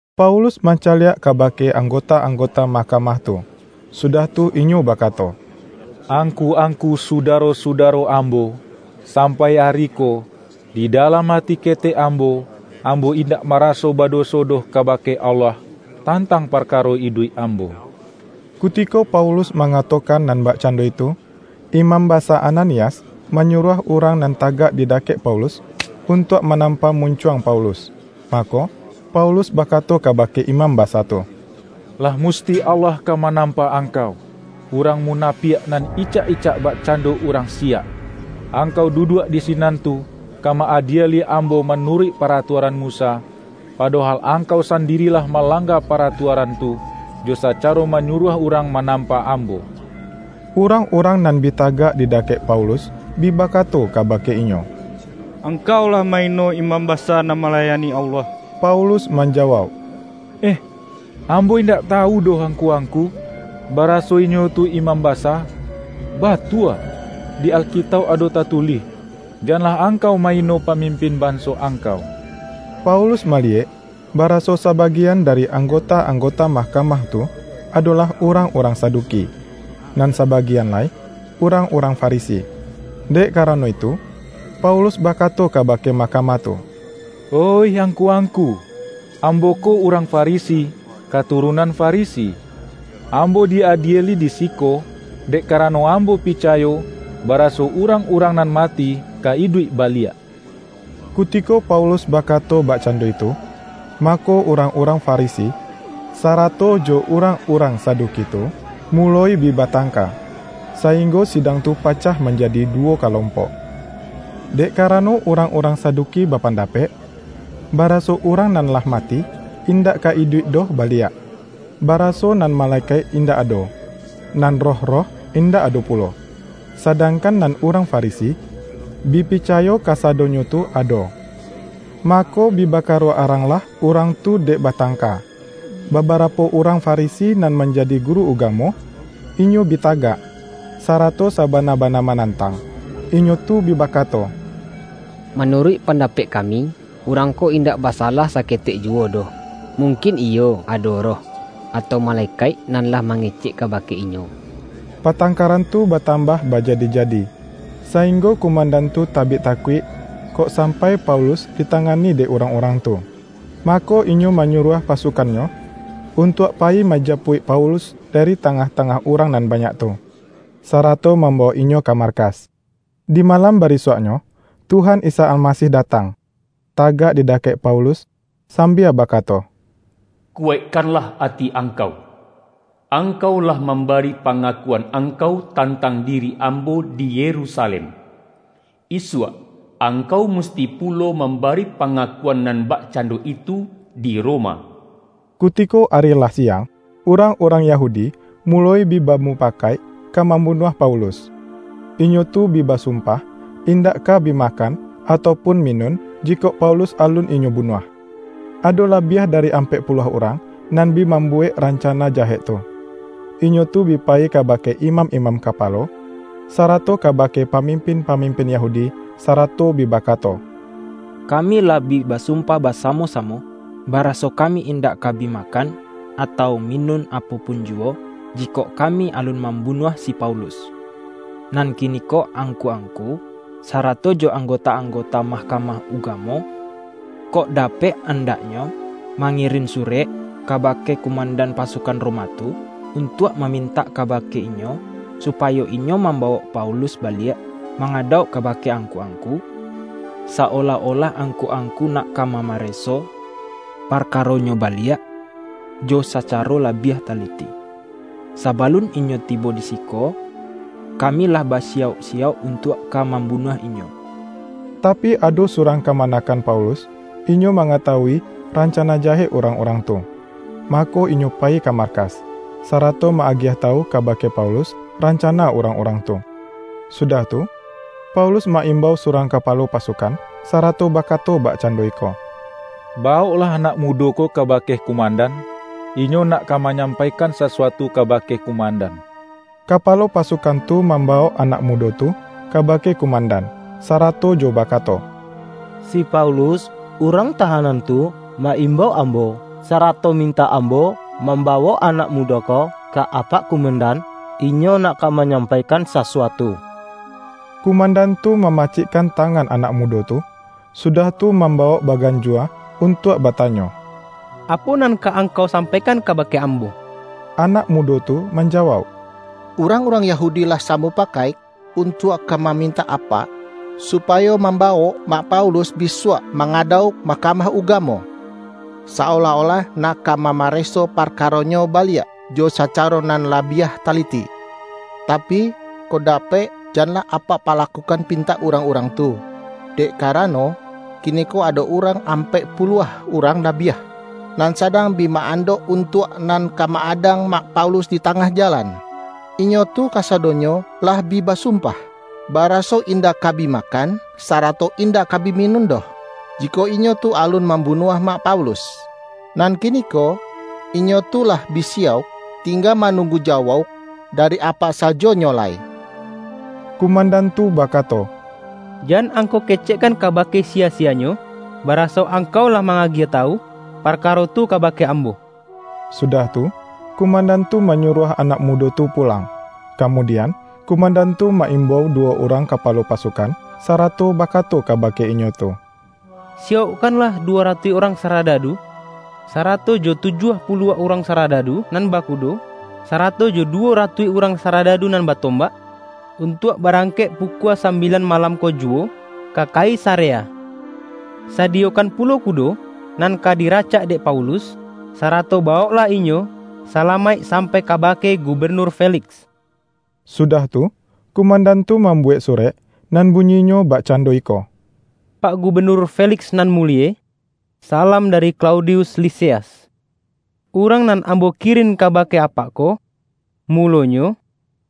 Paulus mancaliak kabake anggota-anggota mahkamah tu, sudah tu inyo bakato,”Angku-angku, sudaro-sudaro ambo! Sampai ari ko, di dalam ati ketek ambo, ambo indak maraso badoso doh kabake Allah, tantang parkaro iduik ambo.” Kutiko Paulus mangatokan nan bakcando itu, Imam Basa Ananias manyuruah urang nan tagak di dakek Paulus, untuak manampa muncuang Paulus. Mako, Paulus bakato kabake imam basa tu,”Lah musti Allah ka manampa angkau, urang munapiak nan icak-icak bakcando urang siyak! Angkau duduak di sinan tu, ka ma-adieli ambo manuruik paratuaran Musa, padohal angkau sandiri lah malangga paratuaran tu, jo sacaro manyuruah urang manampa ambo!” Urang-urang nan bi tagak di dakek Paulus, bi bakato kabake inyo,”Angkau lah ma-ino imam basa nan malayani Allah!” Paulus manjawauk,”Eh, ambo indak tawu doh angku-angku, baraso inyo tu imam basa. Batua, di Alkitauk ado tatulih, ’Janlah angkau ma-ino pamimpin banso angkau.’” Paulus maliyek, baraso sabagian dari anggota-anggota mahkamah tu, adolah urang-urang Saduki, nan sabagian lai urang-urang Farisi. Dek karano itu, Paulus bakato kabake mahkamah tu,”Oih angku-angku! Ambo ko urang Farisi, katurunan Farisi. Ambo di-adieli di siko, dek karano ambo picayo, baraso urang-urang nan mati, ka iduik baliak.” Kutiko Paulus bakato bakcando itu, mako, urang-urang Farisi sarato jo urang-urang Saduki tu, muloi bi batangka, sainggo sidang tu pacah manjadi duwo kalompok. ( Dek karano, urang-urang Saduki bapandapek, baraso urang nan lah mati, indak ka iduik doh baliak, baraso nan malekaik indak ado, nan roh-roh, indak ado pulo; sadangkan nan urang Farisi, bi picayo kasadonyo tu ado.) Mako, bi bakaruak aranglah urang tu dek batangka. Babarapo urang Farisi nan manjadi guru ugamo, inyo bi tagak, sarato sabana-bana manantang. Inyo tu bi bakato,”Manuruik pandapek kami, urang ko indak basalah saketek juwo doh! Mungkin iyo ado roh, atau malekaik nan lah mangecek kabake inyo!” Patangkaran tu batambah bajadi-jadi, sainggo kumandan tu tabik takuik, kok sampai Paulus ditangani dek urang-urang tu. Mako, inyo manyuruah pasukannyo, untuak payi manjapuik Paulus dari tangah-tangah urang nan banyak tu, sarato mambawok inyo ka markas. Di malam barisuaknyo, Tuhan Isa Almasih datang, tagak di dakek Paulus sambia bakato,”Kuwaikkanlah ati angkau! Angkau lah mambari pangakuan angkau, tantang diri Ambo di Yerusalem. Isuak, angkau musti pulo mambari pangakuan nan bakcando itu di Roma.” Kutiko ari lah siang, urang-urang Yahudi muloi bi bamupakaik ka mambunuah Paulus. Inyo tu bi basumpah, indak ka bi makan, atau pun minun, jikok Paulus alun inyo bunuah. Ado labiah dari ampek puluah urang, nan bi mambuwek rancana jahek tu. Inyo tu bi payi kabake imam-imam kapalo, sarato kabake pamimpin-pamimpin Yahudi, sarato bi bakato,”Kami lah bi basumpah basamo-samo, baraso kami indak ka bi makan, atau minun apo pun juwo, jikok kami alun mambunuah si Paulus. Nan kiniko angku-angku, sarato jo anggota-anggota Mahkamah Ugamo, kok dapek andaknyo mangirin surek kabake kumandan pasukan Roma tu, untuak mamintak kabake inyo, supayo inyo mambawok Paulus baliak mangadauk kabake angku-angku, sa-olah-olah angku-angku nak ka mamareso parkaronyo baliak, jo sacaro labiah taliti. Sabalun inyo tibo di siko, kami lah basiyauk-siyauk untuak ka mambunuah inyo.” Tapi, ado surang kamanakan Paulus, inyo mangatawui rancana jahek urang-urang tu. Mako, inyo payi ka markas, sarato ma-agiah tawu kabake Paulus, rancana urang-urang tu. Sudah tu, Paulus ma-imbau surang kapalo pasukan, sarato bakato bakcando iko,”Bawoklah anak mudo ko kabake kumandan; inyo nak ka manyampaikan sasuatu kabake kumandan.” Kapalo pasukan tu mambawok anak mudo tu kabake kumandan, sarato jo bakato,”Si Paulus, urang tahanan tu, ma-imbau ambo, sarato mintak ambo mambawok anak mudo ko, ka apak kumandan; inyo nak ka manyampaikan sasuatu.” Kumandan tu mamacikkan tangan anak mudo tu, sudah tu mambawok baganjua untuak batanyo,”Apo nan ka angkau sampaikan kabake ambo?” Anak mudo tu manjawauk,”Urang-urang Yahudi lah samupakaik, untuak ka mamintak apak, supayo mambawok mak Paulus bisuak mangadauk Mahkamah Ugamo, sa-olah-olah nak ka mamareso parkaronyo baliak, jo sacaro nan labiah taliti. Tapi, kok dapek janlah apak palakukan pintak urang-urang tu, dek karano, kiniko ado urang ampek puluah urang labiah, nan sadang bi ma-andok untuak nan ka ma-adang mak Paulus di tangah jalan. Inyo tu kasadonyo lah bi basumpah, baraso indak ka bi makan, sarato indak ka bi minun doh, jikok inyo tu alun mambunuah mak Paulus. Nan kiniko, inyo tu lah bi siyauk; tingga manunggu jawauk dari apak sajo nyo lai.” Kumandan tu bakato,”Jan angkau kecekkan kabake siyasiyanyo, baraso angkau lah ma-agiah tawu parkaro tu kabake ambo.” Sudah tu, kumandan tu manyuruah anak mudo tu pulang. Kamudian, kumandan tu ma-imbau duwo urang kapalo pasukan, sarato bakato kabake inyo tu,”Siyaukkanlah duwo ratuih urang saradadu, sarato jo tujuah puluah urang saradadu nan bakudo, sarato jo duwo ratuih urang saradadu nan batombak, untuak barangkek pukua sambilan malam ko juwo, ka Kaisarea. Sadiyokan pulo kudo nan ka diracak dek Paulus, sarato bawoklah inyo salamaik sampai kabake Gubenur Feliks.” Sudah tu, kumandan tu mambuwek surek, nan bunyinyo bakcando iko, ”Pak Gubenur Feliks nan mulie. Salam dari Klaudius Lisias! Urang nan ambo kirin kabake apak ko, mulonyo,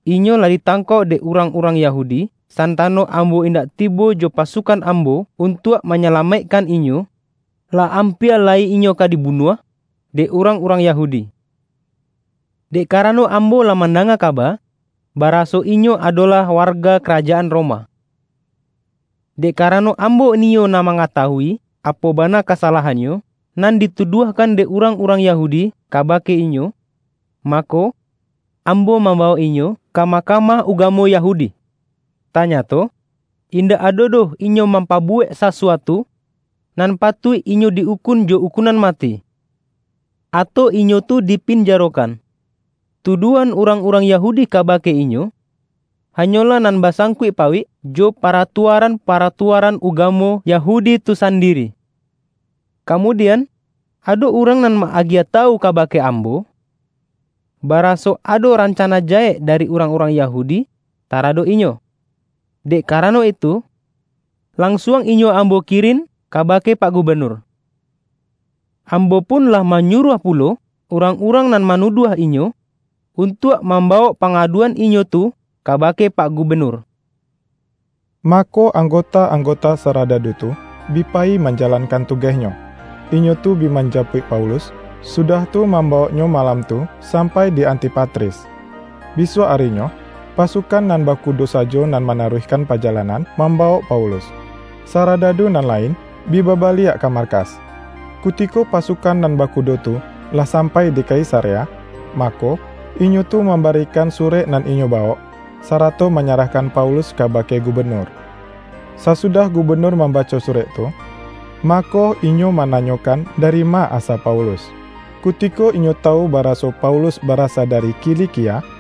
inyo lah ditangkok dek urang-urang Yahudi, santano ambo indak tibo jo pasukan ambo untuak manyalamaikkan inyo, lah ampia lai inyo ka dibunuah dek urang-urang Yahudi; dek karano ambo lah mandanga kaba, baraso inyo adolah warga karajaan Roma. Dek karano ambo niyo nak mangatawui, apo bana kasalahannyo, nan dituduahkan dek urang-urang Yahudi kabake inyo, mako, ambo mambawok inyo ka Mahkamah Ugamo Yahudi. Tanyato, indak ado doh inyo mampabuwek sasuatu, nan patuik inyo di-ukun jo ukunan mati, atau inyo tu dipinjarokan. Tuduahan urang-urang Yahudi kabake inyo, hanyolah nan basangkuik-pauik jo paratuaran-paratuaran ugamo Yahudi tu sandiri. Kamudian, ado urang nan ma-agiah tawu kabake ambo, baraso ado rancana jahek dari urang-urang Yahudi taradok inyo. Dek karano itu, lansuang inyo ambo kirin kabake Pak Gubenur. Ambo pun lah manyuruah pulo urang-urang nan manuduah inyo, untuak mambawok pangaduan inyo tu kabake Pak Gubenur.” Mako, anggota-anggota saradadu tu bi payi manjalankan tugehnyo. Inyo tu bi manjapuik Paulus, sudah tu mambawoknyo malam tu sampai di Antipatris. Bisuak arinyo, pasukan nan bakudo sajo nan manaruihkan pajalanan mambawok Paulus, saradadu nan lain, bi babaliak ka markas. Kutiko pasukan nan bakudo tu, lah sampai di Kaisarea, mako, inyo tu mambarikan surek nan inyo bawok, sarato manyarahkan Paulus kabake gubenur. Sasudah gubenur mambaco surek tu, mako, inyo mananyokan dari ma asa Paulus. Kutiko inyo tawu baraso Paulus barasa dari Kilikia,